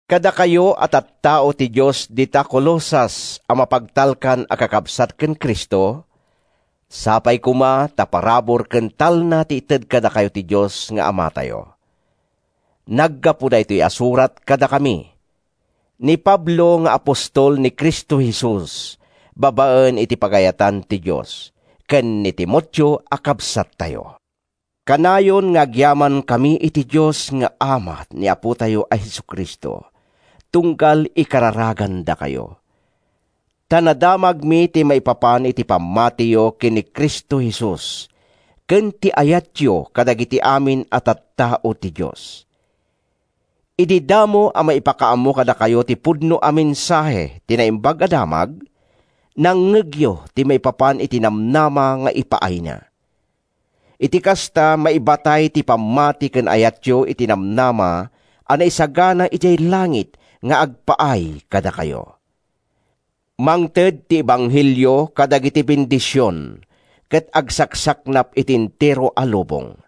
Kadakayo a tattao ti Dios dita Colosas a mapagtalkan a kakabsat ken Cristo, Sapay koma ta parabur ken talna ti ited kadakayo ti Dios nga Amatayo. Naggapu daytoy a surat kadakami—ni Pablo nga apostol ni Cristo Jesus babaen iti pagayatan ti Dios, ken ni Timoteo a kabsattayo. Kanayon nga agyamankami iti Dios nga Ama ni Apotayo a Jesu-Cristo tunggal ikararagandakayo. Ta nadamagmi ti maipapan iti pammatiyo ken ni Cristo Jesus ken ti ayatyo kadagiti amin a tattao ti Dios. Idi damo a maipakaammo kadakayo ti pudno a mensahe, ti Naimbag a Damag, nangngegyo ti maipapan iti namnama nga ipaayna. Iti kasta, maibatay ti pammati ken ayatyo iti namnama a naisagana idiay langit nga agpaay kadakayo. Mangted ti ebanghelio kadagiti bendision ket agsaksaknap iti entero a lubong.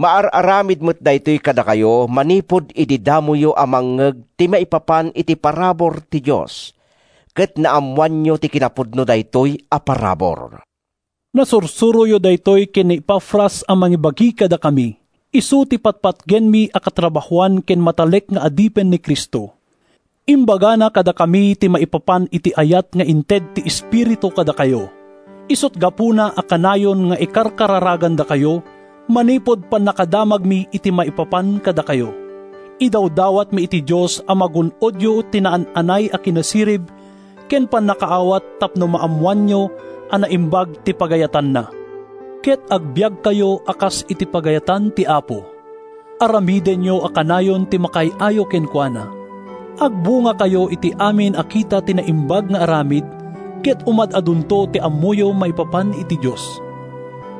Maar-aramid met daytoy kadakayo manipud idi damoyo a mangngeg ti maipapan iti parabur ti Dios ket naammoanyo ti kinapudno daytoy a parabur. Nasursuroyo daytoy ken ni Epafras a mangibagi kadakami. Isu ti patpatgenmi a katrabahoan ken matalek nga adipen ni Cristo. Imbagana kadakami ti maipapan iti ayat nga inted ti Espiritu kadakayo. Isut’ gapuna a kanayon nga ikarkararagandakayo manipud pannakadamagmi iti maipapan kadakayo. Idawdawatmi iti Dios a magun-odyo ti naan-anay a kinasirib ken pannakaawat tapno maammoanyo a naimbag ti pagayatanna, ket agbiagkayo a kas iti pagayatan ti Apo. Aramidenyo a kanayon ti makaay-ayo kenkuana. Agbungakayo iti amin a kita ti naimbag nga aramid, ket umad-adunto ti ammoyo maipapan iti Dios.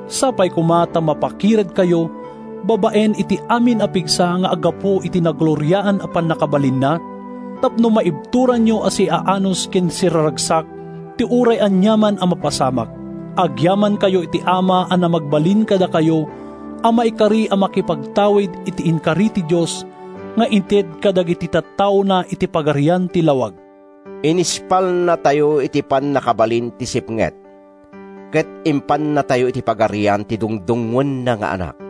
Sapay koma ta mapakiredkayo babaen iti amin a pigsa nga aggapu iti nagloriaan a pannakabalinna, tapno maibturanyo a siaanus ken siraragsak ti uray aniaman a mapasamak. Agyamankayo iti Ama a namagbalin kadakayo a maikari a makipagtawid iti inkari ti Dios nga ited kadagiti tattaona iti pagarian ti lawag. Inispalnatayo iti pannakabalin ti sipnget ket impannatayo iti pagarian ti dungdungngoenna nga Anak.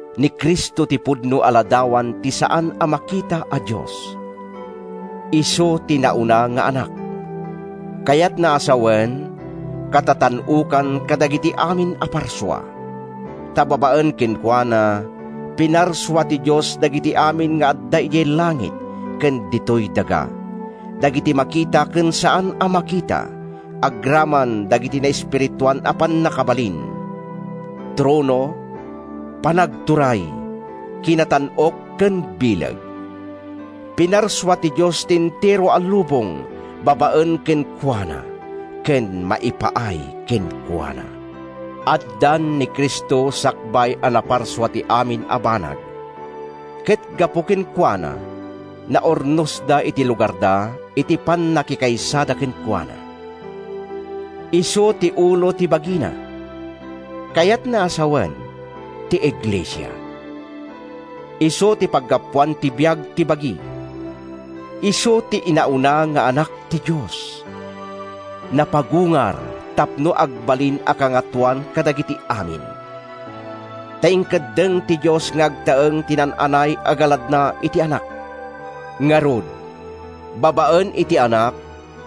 Ni Cristo ti pudno a ladawan ti saan a makita a Dios. Isu ti inauna nga Anak, kayatna a sawen, katatan-okan kadagiti amin a parsua. Ta babaen kenkuana, pinarsua ti Dios dagiti amin nga adda idiay langit ken ditoy daga, dagiti makita ken saan a makita agraman dagiti naespirituan a pannakabalin; trono, panagturay, kinatan-ok ken bileg. Pinarsua ti Dios ti entero a lubong babaen kenkuana ken maipaay kenkuana. Addan ni Cristo sakbay a naparsua ti amin a banag, ket gapu kenkuana naurnosda iti lugarda iti pannakikaysada kenkuana. Isu ti ulo ti bagina, kayatna a sawen, ti iglesia. Isu ti paggapuan ti biag ti bagi. Isu ti inauna nga Anak ti Dios. Napagungar tapno agbalin a kangatoan kadagiti amin. Ta inkeddeng ti Dios nga agtaeng ti naan-anay a galadna iti Anak. Ngarud, babaen iti Anak,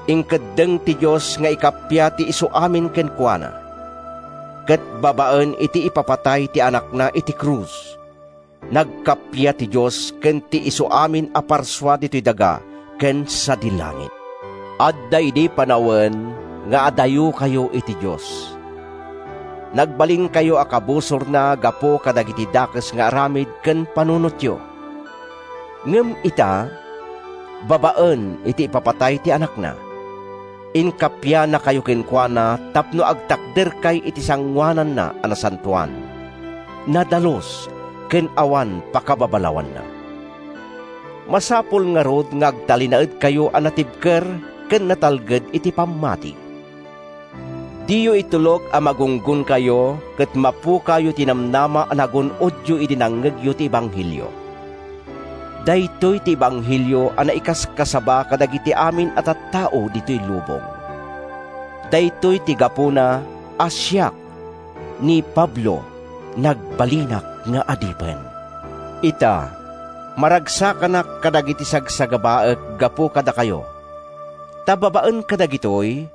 inkeddeng ti Dios nga ikappia ti isuamin kenkuana. Ket babaen iti ipapatay ti Anakna iti krus, nagkappia ti Dios ken ti isuamin a parsua ditoy daga ken sadi langit. Adda idi panawen nga adayokayo iti Dios. Nagbalinkayo a kabusorna gapu kadagiti dakes nga aramid ken panunotyo. Ngem ita, babaen iti ipapatay ti Anakna, inkappianakayo kenkuana tapno agtakderkay iti sangoananna a nasantoan, nadalus ken awan pakababalawanna. Masapul ngarud nga agtalinaedkayo a natibker ken natalged iti pammati. Diyo itulok a magunggonkayo ket mapukawyo ti namnama a nagun-odyo idi nangngegyo ti ebanghelio. Daytoy ti ebanghelio a naikaskasaba kadagiti amin a tattao ditoy lubong. Daytoy ti gapuna a siak, ni Pablo, nagbalinak nga adipen. Ita, maragsakanak kadagiti sagsagabaek gapu kadakayo. Ta babaen kadagitoy,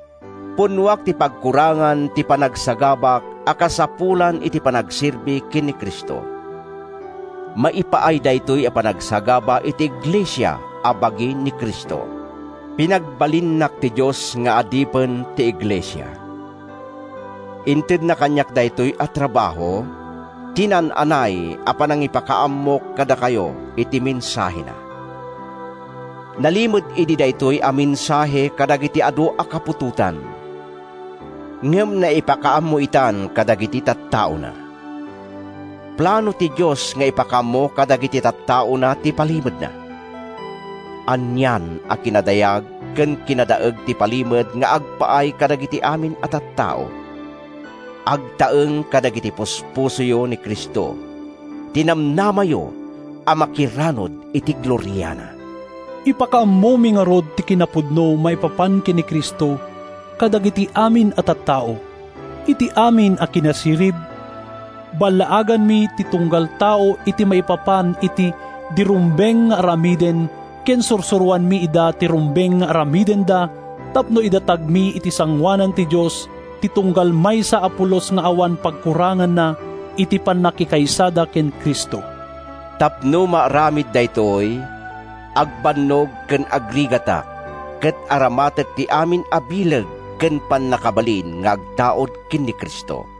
punnoak ti pagkurangan ti panagsagabak a kasapulan iti panagserbi ken ni Cristo. Maipaay daytoy a panagsagaba iti iglesia a bagi ni Cristo. Pinagbalinnak ti Dios nga adipen ti iglesia. Intedna kaniak daytoy a trabaho, ti naan-anay a panangipakaammok kadakayo iti mensahena. Nailimed idi daytoy a mensahe kadagiti adu a kaputotan, ngem naipakaammo itan kadagiti tattaona. Plano ti Dios nga ipakaammo kadagiti tattaona ti palimedna. Anian a kinadayag ken kinadaeg ti palimed nga agpaay kadagiti amin a tattao: Agtaeng kadagiti puspusoyo ni Cristo, ti namnamayo a makiranud iti gloriana. Ipakaammomi ngarud ti kinapudno maipapan ken ni Cristo kadagiti amin a tattao. Iti amin a kinasirib, ballaaganmi ti tunggal tao iti maipapan iti di rumbeng nga aramiden ken sursuroanmi ida iti rumbeng nga aramidenda tapno idatagmi iti sangoanan ti Dios ti tunggal maysa a pulos nga awan pagkuranganna iti pannakikaysada ken Cristo. Tapno maaramid daytoy, agbannog ken agrigatak ket aramatek ti amin a bileg ken pannakabalin nga agtaud ken ni Cristo.